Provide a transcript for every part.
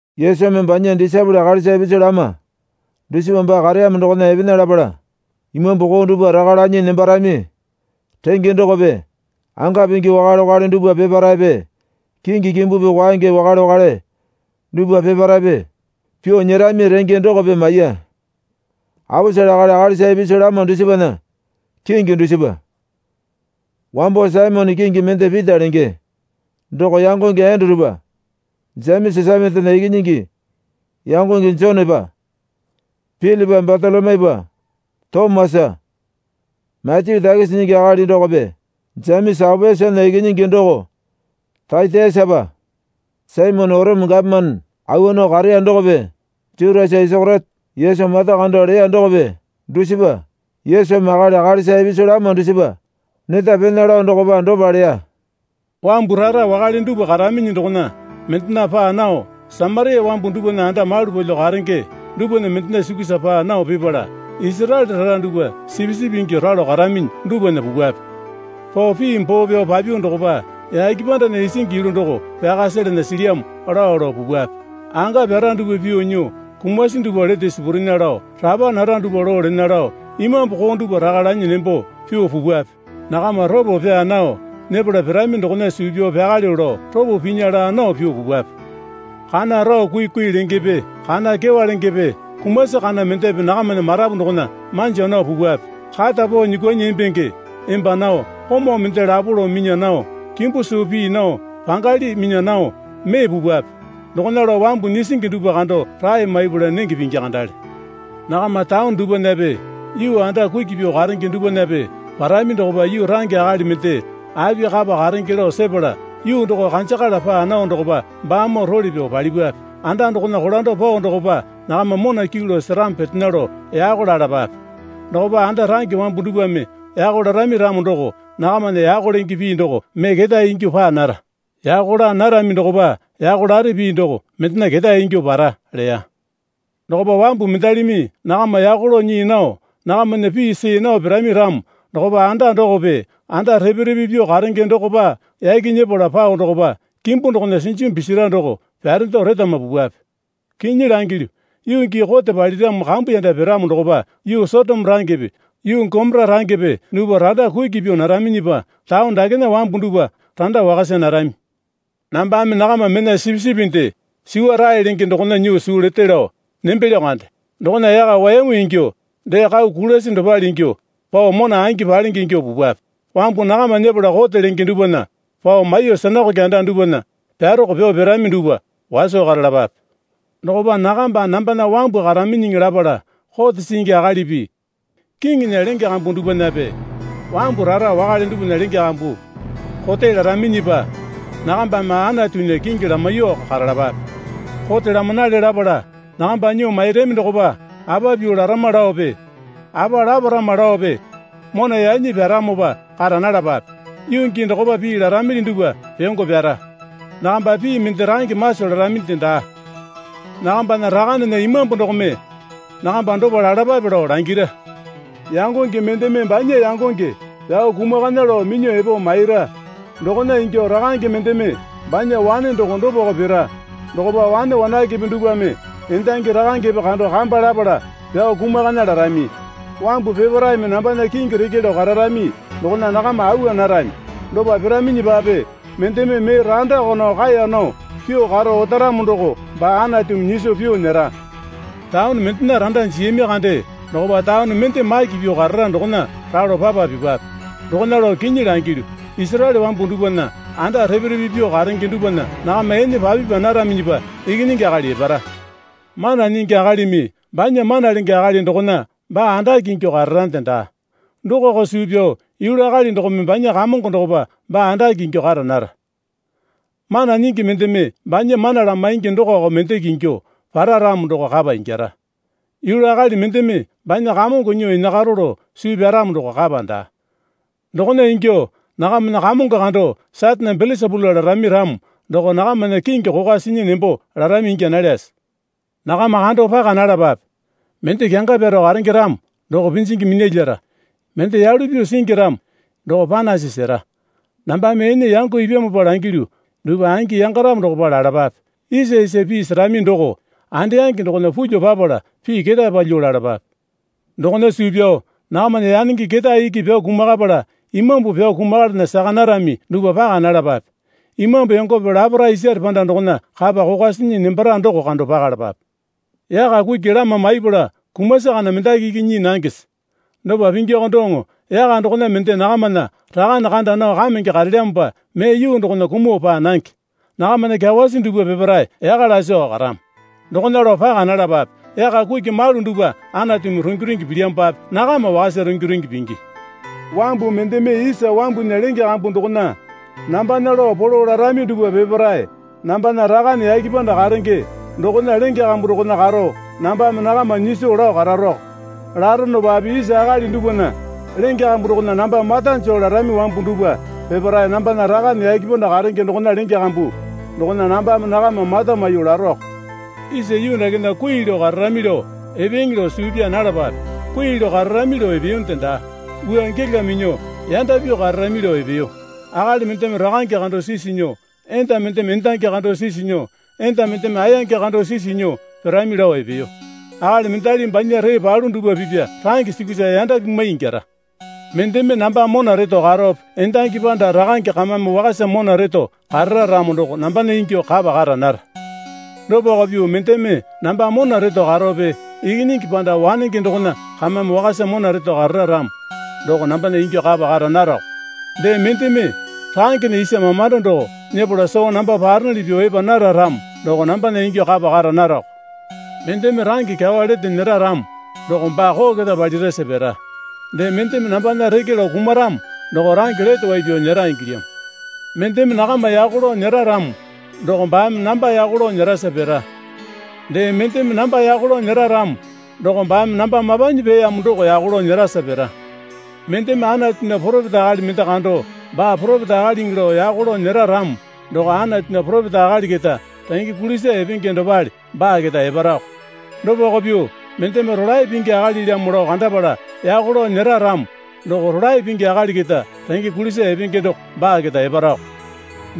Yesumi banya disaepole akalisa ipisu lama dusipa baa kareyamo dokona epena lapala imambu koo dupwa raka lanyi nembarami renge dokope anga pingi wakale wakale dupwa peparaepe kingi kimbupi kwaenge wakale wakale dupwa peparaepe pyuo nyerami renge dokope maiya. Aposele akali akalisa ipisu lama dusipana kingi dusipa, wambo Saimone kingi mende Pita lenge doko yangonge Endurupa, Jemesa Sepetena ikinyingi yangonge Jonepa, Pilipa Batolomyupa, Tomasa, Matyu takisi nyingi akali dokope, Jemesa Aopiasana ikinyingi doko Tatiasapa, Saimone Orome gapomane awa nao kareya dokope Jutasa Isakeriote Yesu mata kando leya dokope, dusipa. Yesumi akali akalisa ipisu lama dusipa neta pena lao dokopa dopa leya. Wambu rara wakale dupwa karaminyi dokona mendena paa nao Samaria wambu dupwana anda malu palyuo karenge dupwana mendena sukusa paa nao pipala Isaraele rara dupwa sipisipi ingyuo ralo karaminyi dupwana pupwape. Pao pii boo pyao papyuo dokopa, Yake pandana isingi yulu doko pyaka selena silyamo, lao lao pupwape. Anga pyara dupwa pyuo nyuo, kumasi dupwa lete sipurena lao, rapa nara dupwa loo lena lao, imambu koo dupwa raka lanyi nembo pyuo pupwape. Nakama ropo pyaa nao nyepala pirami dokona suu pyao pyakalyuo lao ropo pinya laa nao pyuo pupwape. Kana rao kuikui lengepe kana kyewa lengepe kumasi kana mendepe nakamana marapu dokona manja nao pupwape. Kata pao nyuukwuanyi embenge emba nao komau mende lapo lao minya nao kimbu suu pii nao pangali minya nao mee pupwape. Dokona lao wambu nyisingi dupwa kando rae maipala nenge pingi kandale. Nakama taone dupwanape yuu anda kuki pyuo karenge dupwanape parami dokopa yuu range akali mende api kapa karenge lao sepala yuu doko kanjakala paa nao dokopa baamoo role pyao palipwape. Anda dokona kolando pao dokopa nakama mona kyuu lao seramo petena lao yako lalapape. Dokopa anda range wambu dupwame yako larami ramo doko nakamana yako lenge pii doko mee ketae ingyuo paa nara. Yako laa narami dokopa yako lare pii doko mendena ketae ingyuo para leya. Dokopa wambu mendalimi nakama yako lao nyii nao nakamana pii see nao pirami ramo dokopa anda dokope anda repe repe pyuo karenge dokopa yaki nyepala pao dokopa kimbu dokona sinjimu pisira doko pyarendo retama pupwape. Kinyi langilyu, yuu gii kote paliramo kambuyanda piramo dokopa yuu Sotoma rangepe yuu Gomora rangepe dupwa randa kuki pyuo naraminyipa taone dakena wambu dupwa randa wakasa narami. Nambame nakama mena sipisipinde suwa rae lenge dokona nyuo suu lete lao nembelyo kande. Dokona yaka wayamu ingyuo dee kau kulasi dopale ingyuo pao mona angi palenge ingyuo pupwape. Wambu nakama nyepala kote lenge dupwana pao maiyuo sinakoke anda dupwana pyaroko pyao pirami dupwa waso karalapape. Dokopa nakamba nambana wambu karaminyiŋi lapala kote singi akalipi kiŋinya lenge kambu dupwanape wambu rara wakale dupwana lenge kambu kote laraminyipa nakambame Anatunya kingi lamaiyuoko karalapape. Kote lamanale lapala nakamba nyuo mairami dokopa apa pyuo larama laope apa laparama laope mona yanyi pyaramopa kara nalapape. Yuu gii dokopa pii laramili dupwa pyongo pyara. Nakamba pii mende range maso laraminde daa, Nakambana Rakanena Imambu dokome nakamba dopa lalapape lao langira. Yangonge mendeme banya yangonge pyao kumakana lao minyuo epo maira. Dokona ingyuo rakange mendeme banya wane doko dopako pira. Dokopa wane wanakepe dupwame endangi rakangepe kando kamba lapala pyao kumakana larami. Wambu peparaeme nambana kingi reke lao kararami dokona nakama awa narami. Dopa piraminyipape mendeme mee randako nao kaeya nao pyuo karo otaramo doko baa Anatumi nyiso pyuo nyera. Taone mendena randa jiyami kande dokopa taone mende maki pyuo karara dokona ralo papa pipape. Dokona lao kinyi langilyu, Isaraele wambu dupwana anda repe repe pyuo karenge dupwana nakama ene papipa naraminyipa Ikinyingi Akali epara. Mana nyingi akalimi banya mana lenge akali dokona baa andake ingyuo kararande daa. Dokako suu pyao yulu akali dokome banya kamongo dokopa baa andake ingyuo kara nara. Mana nyingi mendeme banya mana lamaingi dokako mendeke ingyuo para ramo doko kapa ingyara. Yulu akali mendeme banya kamongo nyuo enakaro lao suu pyaramo doko kapa daa. Dokona ingyuo nakamana kamongo kando Satane Belesapula larami ramo doko nakamana kingi kokwa sinya nembo larami ingya nalyase? Nakama kando paka nalapape. Mende kyanga pyaro karenge ramo doko pinjingi minyalyara, mende yalu pyuo singi ramo doko panasi sera. Nambame ene yango ipyamopa langilyu dupwa angi yangaramo dokopa lalapape. Isa isa pii serami doko andayange dokona pulyuo papala pii ketae palyuo lalapape. Dokona suu pyao nakamana yanenge ketae iki pyao kumakapala imambu pyao kumakalana saka narami dupwa paka nalapape. Imambu yongope laparae isare panda dokona kapa kokwa sinyi nembara doko kando pakalapape. Yaka kuki lama maiyapala kumasi kana mendaki iki nyii nangese? Dopa pingiko doŋo yaka dokona mende nakamana Rakane kanda nao kamenge karelyamopa mee yuu dokona kumuo paa nange. Nakamana kyawasi dupwa peparae yaka lasiko karamo. Dokona lao paka nalapape. Yaka kuki malu dupwa Anatumi rungi rungi pilyamopape nakama wakasa rungi rungi pingi. Wambu mendeme isa wambunya lenge kambu dokona nambana lao polo larami dupwa peparae nambana Rakane yake panda karenge dokona lenge kambu dokona karo nambame nakama nyiso lao kararoko. Laronopape isa akali dupwana lenge kambu dokona namba mata joo larami wambu dupwa peparae nambana Rakane yake panda karenge dokona lenge kambu dokona nambame nakama mata maiyuo laroko. Isa yuu dakena kui lao kararami lao epeeŋe lao suu pyaa nalapape. Kui lao kararami lao epeyonde daa. Wua gela minyuo yanda pyuo kararami lao epeyo. Akali mendeme rakange kando sisu nyuo enda mendeme endangi kando sisu nyuo enda mendeme ayange kando sisu nyuo pirami lao epeyo. Akali mendali banya ree palu dupwa pipya range sukusa yanda pimwai ingyara. Mendeme namba mona reto karope endangi panda rakange kamame wakasa mona reto karara ramo doko nambana ingyuo kapa kara nara. Dopako pyuo mendeme namba mona reto karope ikinyingi panda wanenge dokona kamame wakasa mona reto karara ramo doko nambana ingyuo kapa kara narako. Dee, mendeme rangena isa mamando doko nyepala soo namba paronuli pyuo epa nara ramo doko nambana ingyuo kapa kara narako. Mendeme range kyawa lete nyera ramo doko baa koo keta palirasa pira. Dee mendeme nambana reke lao kumaramo doko range lete wai pyao nyera ingilyamo. Mendeme nakama yako lao nyera ramo doko baame namba yako lao nyerasa pira. Dee, mendeme namba yako lao nyera ramo doko baame namba mapanyi peeyamo doko yako lao nyerasa pira. Mendeme Anatunya poropeta akali mende kando baa poropeta akaliŋi lao yako lao nyera ramo doko Anatunya poropeta akali keta renge kulisa epenge dopale baa keta eparako. Dopako pyuo mendeme rolae pingi akalilamo lao kandapala yako lao nyera ramo doko rolae pingi akali keta renge kulisa epenge doko baa keta eparako.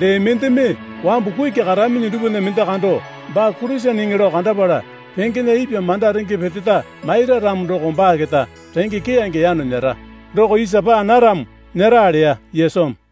Dee, mendeme wambu kuki karaminyi dupwana mende kando baa Kuriseneŋe lao kandapala pengena ipwa manda renge peteta maira ramo doko baa keta renge keyange yano nyera doko isa panaramo nyera leya Yesumi.